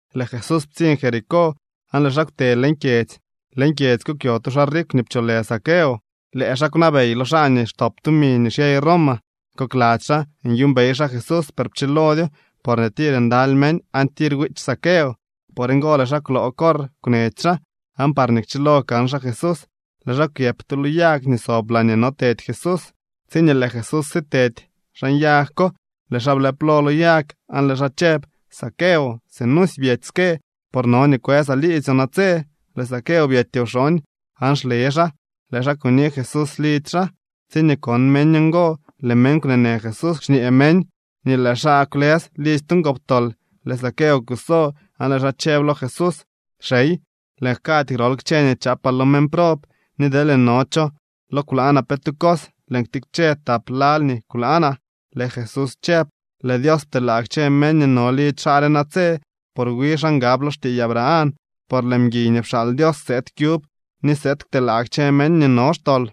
Lëë Jesús ptsiñ Jericó aan lëë xaa kwte leñ kyedzy. Leñ kyedzy ko kwyo tu xaa rikw nii pcholë Zaqueo. Lëë xaa kwnabey lo xaa nii xtop tumi nii xyey Roma. Kokladzy xaa nyuumbey xaa Jesús, per pchilodyo porñee tir ndaly meñ aan tir wiich Zaqueo. Por ngo lëë xaa kwloo corr kwnech xaa, aan parñee kchilo kan xaa Jesús, lëë xaa kwyëp tu lo yag nii sob laañee notedy Jesús. Tsiñee lëë Jesús sitedy xan yag ko, lëë xaa blëp lo lo yag, aan lëë xaa chëb: —Zaqueo, sinusy byety ske, por no nii kwësaa liidzyoo natse. Lëë Zaqueo byety wxooñ, aan xle xaa lëë xaa kuni Jesús lidzy xaa. Tsiñee kon meñ ngo, lëë meñ kwneenë Jesús, xñee meñ nii lëë xaa kwlës lidzy tu ngoptol. Lëë Zaqueo kuso, aan lëë xaa chëb lo Jesús: —Xey, lëën jkady grol kchë nii chaapaa lo meñ prob. Ni deelñee no cho lo kwlaanaa pe tu cos, lëën ktikche tap lal nii kwlaanaa. Lëë Jesús chëb: —Lëë Dios pteelaa kchë meñ nii no lidzy xaa re natse, por wi xaa ngab lo xtiiy Abraham. Por lëë mguiy nii pxaal Dios sëëd kyub ni sëëd kteelaa kchë meñ nii no xtol.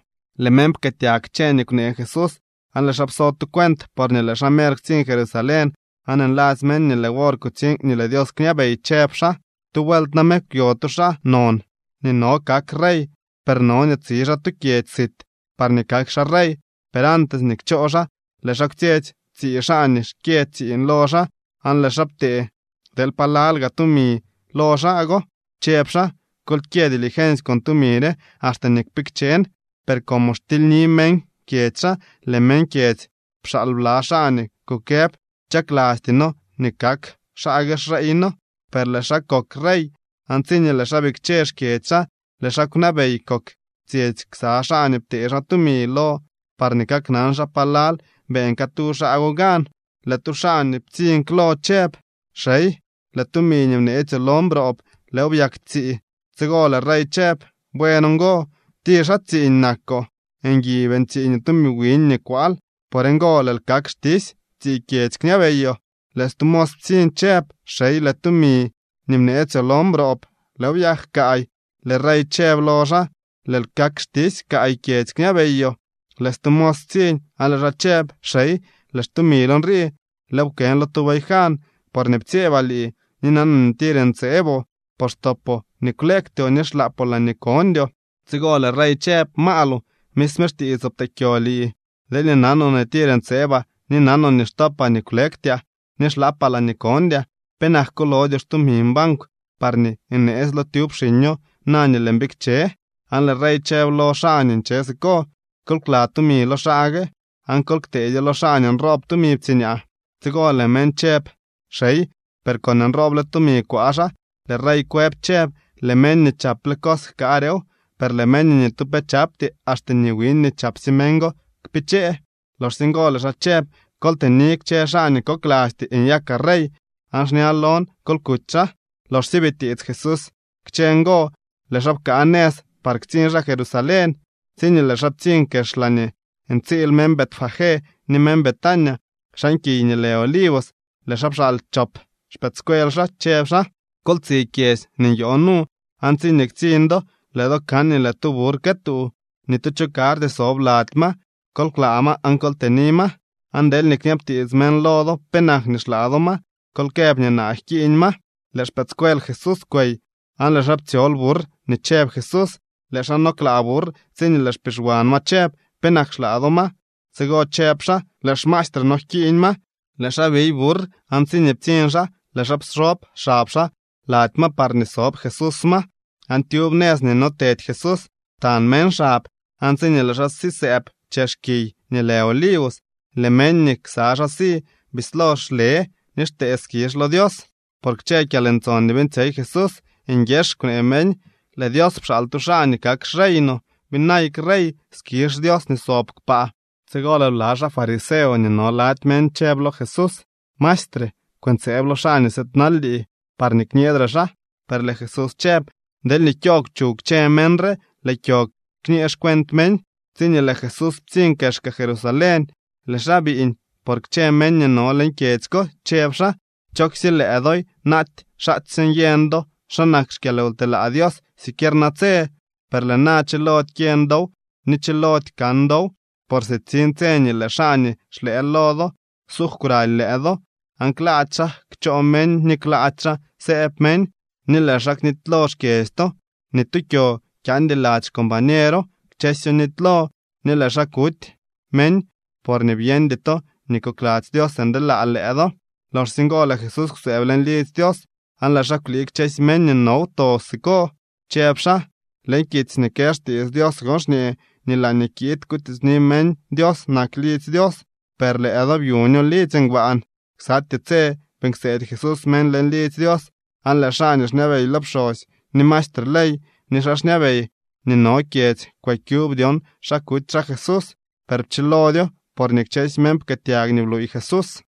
Lëë meñ pkëëtyag kchë nii kwnee Jesús, aan lëë xaa pso tu cuent, porñee lëë xaa mer ktsiñ Jerusalén, aan nladzy meñ nii lëë wor kutsiñ nii lëë Dios kñabey, chëb xaa: —Tu vuelt name kwyo tu xaa non nii no kak rey, per no nii tsi xaa tu kyedzy sit parñee kak xaa rey. Per antes nii kchoo xaa, lëë xaa kwtsyetsy tsii xaa nii xkyë tsiiñ lo xaa, aan lëë xaa ptee deel palal gaa tumi lo xaa go, chëb xaa: “Kol kyë dilgensy con tumi re axte nii kpikchen.” Per como xtilyni meñ kyedzy xaa, lëë meñ kyedzy pxaal bla xaa nii kukëb: “Chaklasty noo nii kak xaa gue xrey noo.” Per lëë xaa kok rey, aan tsiñee lëë xaa bikche xkyedzy xaa, lëë xaa kwnabey kok tsyetsy ksa xaa nii ptee xaa tumi lo parñee kaknan xaa palal beeñ catu xaa go gan. Lëë tu xaa nii ptsiñ klo chëb: “Xey, lëë tumi nii bneetsyoo lon broob, lëëw byak tsii.” Tsigo lëë rey chëb: “Buen ngo. Tir xaa tsiiñ nakoo. Ngui beeñ tsiiñoo tumi wiñ nii kwaal. Por ngo lëël kak xtisy. Tsii kyedzy kñabeyoo.” Lëë stu mos ptsiñ chëb: “Xey, lëë tumi nii bneetsyoo lon broob, lëëw byak kaay.” Lëë rey chëb lo xaa: “Lëël kak xtisy. Kaay kyedzy kñabeyoo.” Lëë stu mos ptsiñ aan lëë xaa chëb: “Xey, lëë xtumil nrii. Lëëw pkën lo tu bayjan. Porñee ptsyeebaa lii, ni nanaa nii tir ntseeboo, por xtopoo nii kwleektyoo ni xlaapoo laañee kondyoo.” Tsigo lëë rey chëb: “Maaloo, misme xtiitsoo pteekyo lii. Deelñee nanoo nii tir ntseebaa, ni nanoo nii xtopaa nii kwlektyaa nii xlaapaa laañee kondyaa, ¿penak kulodyoo xtumin bankw parñee neetsylo tyub xiño na nii lëën bikche?” Aan lëë rey chëb lo xaa nii nche siko: “Kol kla tumi lo xaa gue, aan kol kteedyo lo xaa nii nroob tumi ptsiñaa.” Tsigo lëë meñ chëb: “Xey, per con nrooble tumi kwaa xaa.” Lëë rey kwëb chëb: “Lëë meñ nii chaple cos jkaarew, per lëë meñ nii ni tu pe chapty, axte nii wiñ nii chapsye meñ go kpichee.” Loxsye ngo lëë xaa chëb: “Kol tëni kchë xaa nii koklasty nyakaa rey, aan xña lon kol kuty xaa.” Loxsye bitiits Jesús kchë ngo, lëë xaa pkaa nëz par ktsiñ xaa Jerusalén. Tsiñee lëë xaa ptsiñ kex laañee ntsiil meñ Betfagé ni meñ Betania xan kiy nii lë Olivos, lëë xaa pxaal chop xpëëdscuel xaa, chëb xaa: —Kol tsi kyedzy nii nyoo nu, aan tsiñee ktsiñ do, lëë do kan nii lëë tu burr këtuu. Ni tu cho karty sob lady ma. Kol klaa ma aan kol tëni ma. Aan deelñee kñabtiits meñ lo do penak nii xlaa do ma, kol këb nii naa jkiiñ ma. Lëë xpëëdscuel Jesús kwey, aan lëë xaa ptsyol burr nii chëb Jesús. Lëë xaa no klaa burr tsiñee lëë xpixwan ma chëb: —¿Penak xlaa do ma? Tsigo chëb xaa: —Lëë xmaestre noo jkiiñ ma. Lëë xaa biy burr aan tsiñee ptsiñ xaa lëë xaa pxob xab xaa lady ma parñee sob Jesús ma. Aan tyub nëz nii notedy Jesús ptañ meñ xab. Aan tsiñee lëë xaa sisëëb chex kiy nii lë Olivos, lëë meñ nii ksa xaa si bislo xle ni xtee skizh lo Dios por kchë kyalntson nii beeñtsyey Jesús. Nguieex kwnee meñ: —¡Lëë Dios pxaal tu xaa nii kak xrey no! ¡Byinayk rey! ¡Skizh Dios nii sob kpaa! Tsigo lëë bla xaa fariseo nii no lady meñ chëb lo Jesús: —Maestre, kwëntseeb lo xaa nii sëëdnal lii parñee kñeedre xaa. Per lëë Jesús chëb: —Deelñee kyoogw chuw kchë meñ re, lëë kyo kñee xcuent meñ. Tsiñee lëë Jesús ptsiñ kexka Jerusalén, lëë xaa biiñ por kchë meñ nii no leñ kyedzy ko, chëb xaa: —¡Chooksye lëë doy, naaty xaatsye nyeñ do xa nak xkyalwtelaa Dios siquier natse! Per lëë na chilody kyeñ dow ni chilody kan dow. Por sitsiñ tse nii lëë xaa nii xlëë lo do ksuugw kwraly lëë do, aan klaady xaa kchoo meñ ni klaady xaa sëëb meñ, ni lëë xaa knitylo xkyedzy to. Ni tu kyo kyaandy lady xcombañero, kchësyo nitylo. Ni lëë xaa kuty meñ, por byeñdy to nii kokladzy Dios ndeelaa lëë do. Loxsye ngo lëë Jesús kwsëëb leñ lidzy Dios aan lëë xaa kwlii kchësy meñ nii no wto siko, chëb xaa: —Leñ kitsy nii kë xtiits Dios gon xñee nii laañee kiid kutiitsni meñ Dios nak lidzy Dios, per lëë do byuño lidzy ngbaan. Ksatyee tse beeñ kseedy Jesús meñ leñ lidzy Dios. Aan lëë xaa nii xñabey lo pxosy, ni maestre ley ni xaa xñabey nii no kyedzy kwëkyub dyon xa kuty xaa Jesús. Per pchilodyo, porñee kchësy meñ pkëëtyag nii bluuy Jesús.